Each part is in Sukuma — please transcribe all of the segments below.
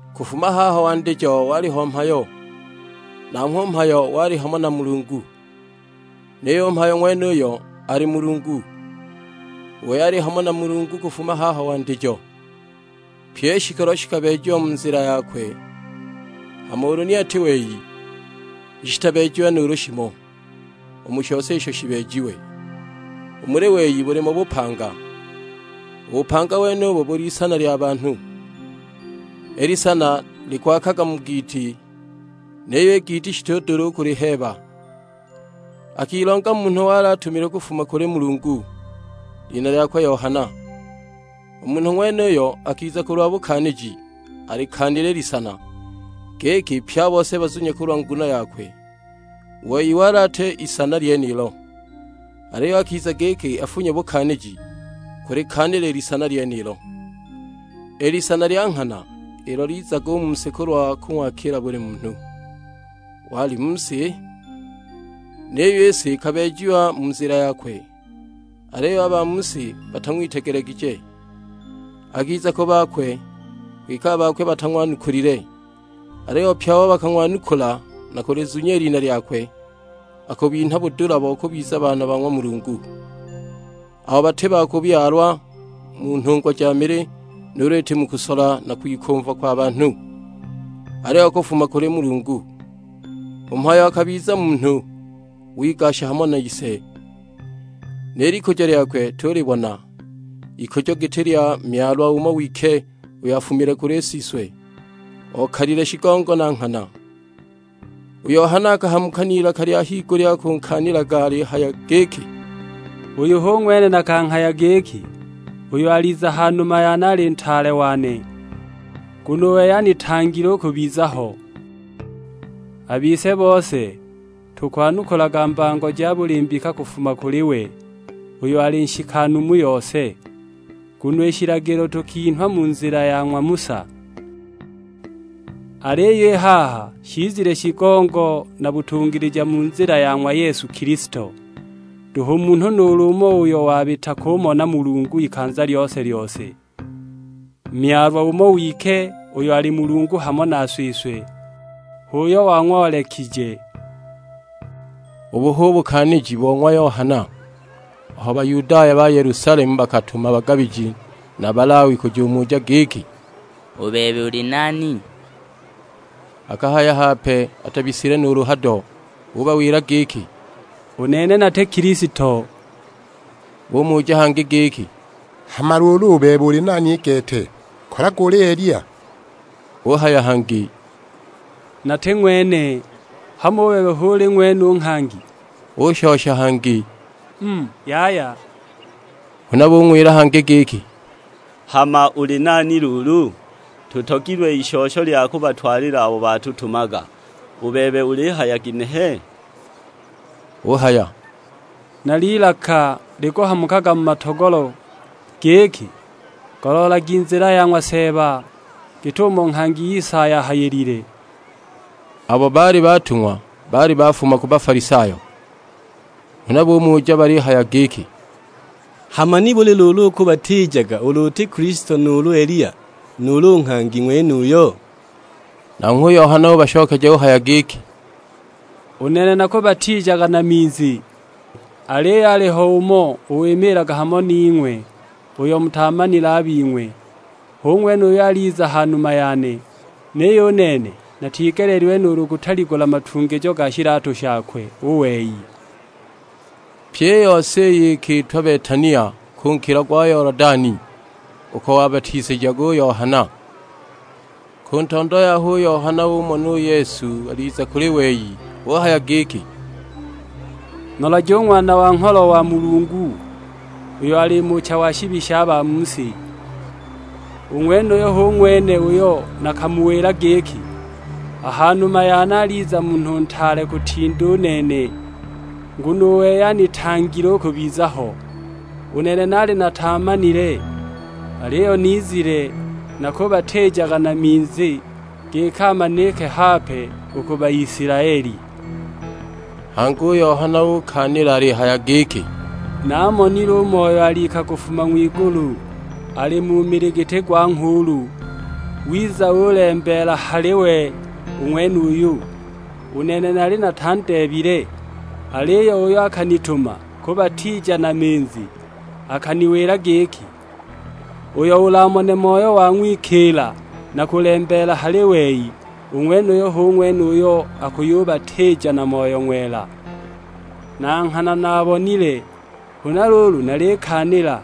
Kufuma haho wandijo waliho Mhayo; nanghwe u Mhayo wali hamo na Mulungu; niyo u Mhayo ng'wenuyo ali nuulu: wali. Mulungu. U wei ali hamo na Mulungu kufuma haho wandijo. Pyi i shikolo shikabeejiwa mu nzila yakwe, hama ulu ni ati wei ni shitabeejiwe nuulu shimo, u mu shose isho shibeejiwe. U muli wei bulimo bupanga. U bupanga wenubo buli isana lya banhu. I lisana likwaakaga mu giiti, niyo i giiti shitudula u kuliheeba! Akilonga munhu wali atumilwe kufuma kuli Mulungu, lina lyakwe Yohana. U munhu ng'wenuyo akiza kulwa bukaaniji, alikaanile i lisana, giki pye a bose bazunye kulwa nguno yakwe. U wei wali ati i lisana lyenilo, aliyo akiza giki afunye bukaaniji, kulikaanila i lisana lyenilo; i lisana lya nghana, ilo lizaga u mu si kulwa kung'wakila buli munhu. Wali mu si; niyo i si ikabeejiwa mu nzila yakwe, aliyo a ba mu si batang'witegelegije. Akiza ku bakwe, kwike a bakwe batang'wanukulile. Aliyo pye abo bakung'wanukula na kulizunya i lina lyakwe, akubinha budula bo kubiza baana ba ng'wa Mulungu; abo bati ba kubyalwa mu nhungwa ja mili, nuulu iti mu kusola na kwikumva kwa banhu: aliyo kufuma kuli Mulungu. U Mhayo akabiza munhu, wigasha hamo nise. Ni likujo lyakwe tuulibona, ikujo giti lya Myalwa umo wike uyo afumile kuli Siswe, okalile shigongo na nghana. U Yohana akahamuka n'ilaka lya higulya akunkaanilaga alihaya giki, "Uyu hu ng'wene nakanghaya giki, 'Uyo aliza ha numa yane ali ntaale wane, nguno u wei anitangile u kubiza ho.' A bise bose tukwanukulaga mbango ja buli mbika kufuma kuli we, uyo ali nshikanu mu yose. Nguno i shilagilo tukinhwa mu nzila ya ng'wa Musa; aliyo i haha shizile shigongo na butungilija mu nzila ya ng'wa Yesu Kilisto. Nduhu munhu nuulu umo uyo wabita kumona Mulungu ikanza lyose-lyose; Myalwa umo wike, uyo ali Mulungu hamo na Siswe; h'uyo wang'oolekije!" Ubu hu bukaaniji bo ng'wa Yohana, aho Bayudaya ba Yelusalemu bakatuma bagabiji na Balawi kujumuja giki, "U bebe, uli nani?" Akahaya hape, atabisile nuulu hado; ubawila giki, "U nene nati Kilisto." Bumuja hangi giki, "Hama luulu u bebe uli nani i gete, kolaga uli Eliya?" Uhaya hangi, "Nati ng'wene!" "Hamo u bebe hu uli ng'wene u Nghangi?" Ushosha hangi, "Mm, yaya." Huna bung'wila hangi giki, "Hama uli nani luulu? Tutogilwe ishosho lya kubatwalila abo batutumaga; u bebe ulihaya ginehe?" Uhaya, "Nal'ilaka likuhamukaga mu matogolo; giki, 'Goloolagi nzila ya ng'wa Seeba;' git'umo nghangi Isaya ahayilile." Abo baali batung'wa baali bafuma ku Bafalisayo; huna bumuja balihaya giki, "Hama nibuli luulu ukubatiijaga, ulu uti Kilisto nuulu Eliya, nuulu u Nghangi ng'wenuyo?" Nanghwe u Yohana ubashokeja uhaya giki, "U nene nakubatiijaga na minzi; aliyo aliho umo wimiilaga hamo ning'we, uyo mutaamanile a bing'we. Hu ng'wene uyo aliza ha numa yane, niyo u nene natigeleelilwe nuulu kutaligula matungijo ga shilatu shakwe u wei!" Pyi i yose iyi ikiitwa Betania ku nkilo gwa Yolodani, uko wabatisijaga u Yohana. Ku ntondo yaho u Yohana umona u Yesu aliza kuli wei: uhaya giki, "Nolagi u Ng'wana wa Ngholo wa ng'wa Mulungu, uyo ali mucha wa shibi sha ba mu si. U ng'wenuyu hu ng'wene uyo nakamuwila giki, 'A ha numa yane aliza munhu ntaale kutinda u nene, nguno u wei anitangile u kubiza ho.' U nene naali nataamanile, aliyo nizile nakubatiijaga na minzi giki amanike hape u ku Baisilaeli." Hangi u Yohana ukaanila alihaya giki, "Namonile u Moyo alika kufuma ng'wigulu, ali mu mili giti gwa nghuulu; wiza ulembeela a hali we u ng'wenuyu. U nene naali natandeebile, aliyo uyo akanituma kubatiija na minzi, akaniwila giki, 'Uyo ulamone Moyo wang'wikiila na kulembeela hali wei, u ng'wenuyo hu ng'wene uyo akuyubatiija na Moyo Ng'wela.' Na nghana naabonile; huna luulu nalikaanila,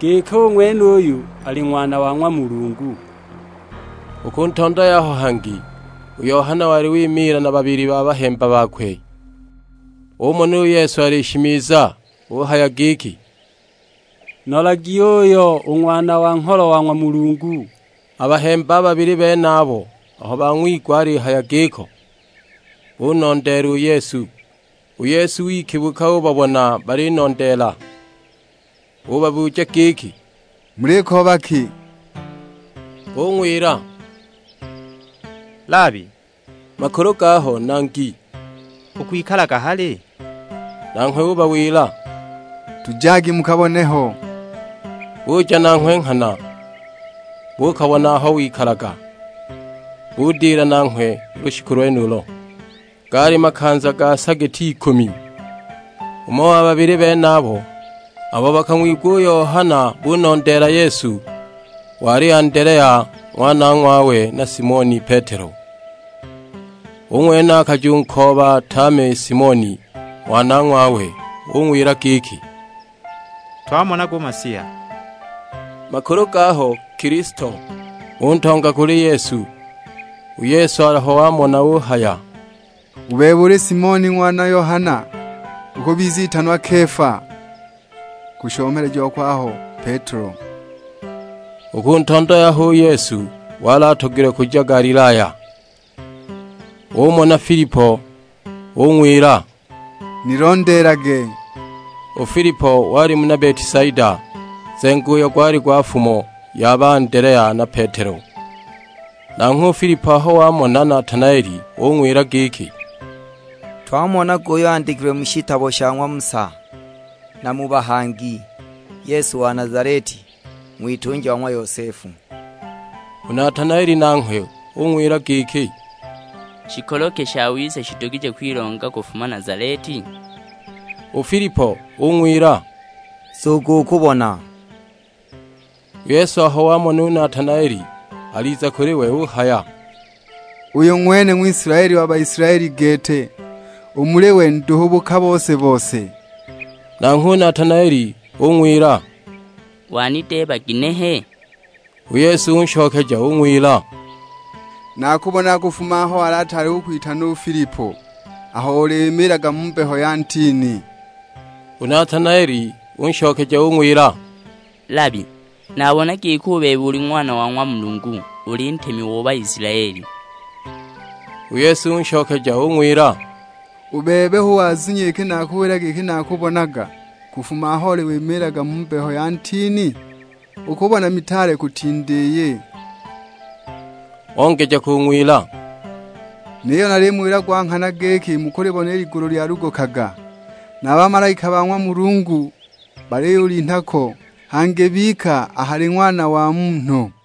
giki u ng'wenuyu ali Ng'wana wa ng'wa Mulungu." U ku ntondo yaho hangi, u Yohana wali wimiila na babili ba bahemba bakwe. Umona u Yesu alishimiza; uhaya giki, "Nolagi uuyo u Ng'wana wa Ngholo wa ng'wa Mulungu!" A bahemba a babili benabo aho bang'wigwa alihaya giko, bunondeela u Yesu. U Yesu wikibuka ubabona balinondeela, ubabuja giki, "Mulikooba ki?" Bung'wila, "Labi (makulu gaho Nangi), ukwikalaga hali?" Nanghwe ubawila, "Tujagi mukabone ho." Buja nanghwe nghana, buukabona aho wikalaga, budila nanghwe u lushiku lwenulo; gaali makanza ga sa giti ikumi. Umo wa babili benabo, abo bakang'wigwa u Yohana bunondeela Yesu, wali Andelea; ng'wanong'wawe na Simoni Petelo. U ng'wene akajunkooba tame Simoni ng'wanong'wawe; ung'wila giki, "Twamonaga u Masiya, (makulu gaho Kilisto)." Untonga u kuli Yesu. U Yesu aho wamona uhaya, "U bebe uli Simoni ng'wana Yohana, ukubizitanwa Kefa (kushomeleja kwaho Petelo makulu gaho: Shiganga. )." U ku ntondo yaho u Yesu wali atogilwe kuja Galilaya, umona Filipo ung'wila, "Nilondeelage." U Filipo wali muna Betisaida, nzengo uyo gwali gwa fumo ya ba Andelea na Petelo. Nanghwe u Filipo aho wamona Natanaeli ung'wila giki, "Twamonaga uyo andikilwe mu shilagilo sha ng'wa Musa, na mu bahangi; Yesu wa Nazaleti, ng'witunja wa ng'wa Yosefu." U Natanaeli nanghwe ung'wila giki, "Shikolo ki shawiza shidugije kwilonga kufuma Nazaleti?" U Filipo ung'wila, "Nzugu ukubona!" U Yesu aho wamona u Natanaeli aliza kuli we uhaya, "Uyu ng'wene Ng'wisilaeli wa Baisilaeli gete, u muli we nduhu buka bose-bose!" Nanghwe u Natanaeli ung'wila, "Wanideeba ginehe?" U Yesu unshokeja ung'wila, "Naakubonaga kufuma aho ataali kukwitana u Filipo, aho oli wimiilaga mu mbeho ya ntini." U Natanaeli unshokeja ung'wila, "Labi, nabona giki u bebe uli Ng'wana o ng'wa Mulungu; uli Ntemi o Baisilaeli." U Yesu unshokeja ung'wila, "U bebe hu wazunya iki nakuwila giki naakubonaga kufuma aho oli wimiilaga mu mbeho ya ntini? Ukubona mitaale kutinda iyi." Ongeja kung'wila, "Niyo nalimuwila gwa nghana giki mukulibona i ligulu lyalugukaga, na bamalaika ba ng'wa Mulungu baliyulinha ko, hangi bika a hali Ng'wana wa Munhu!"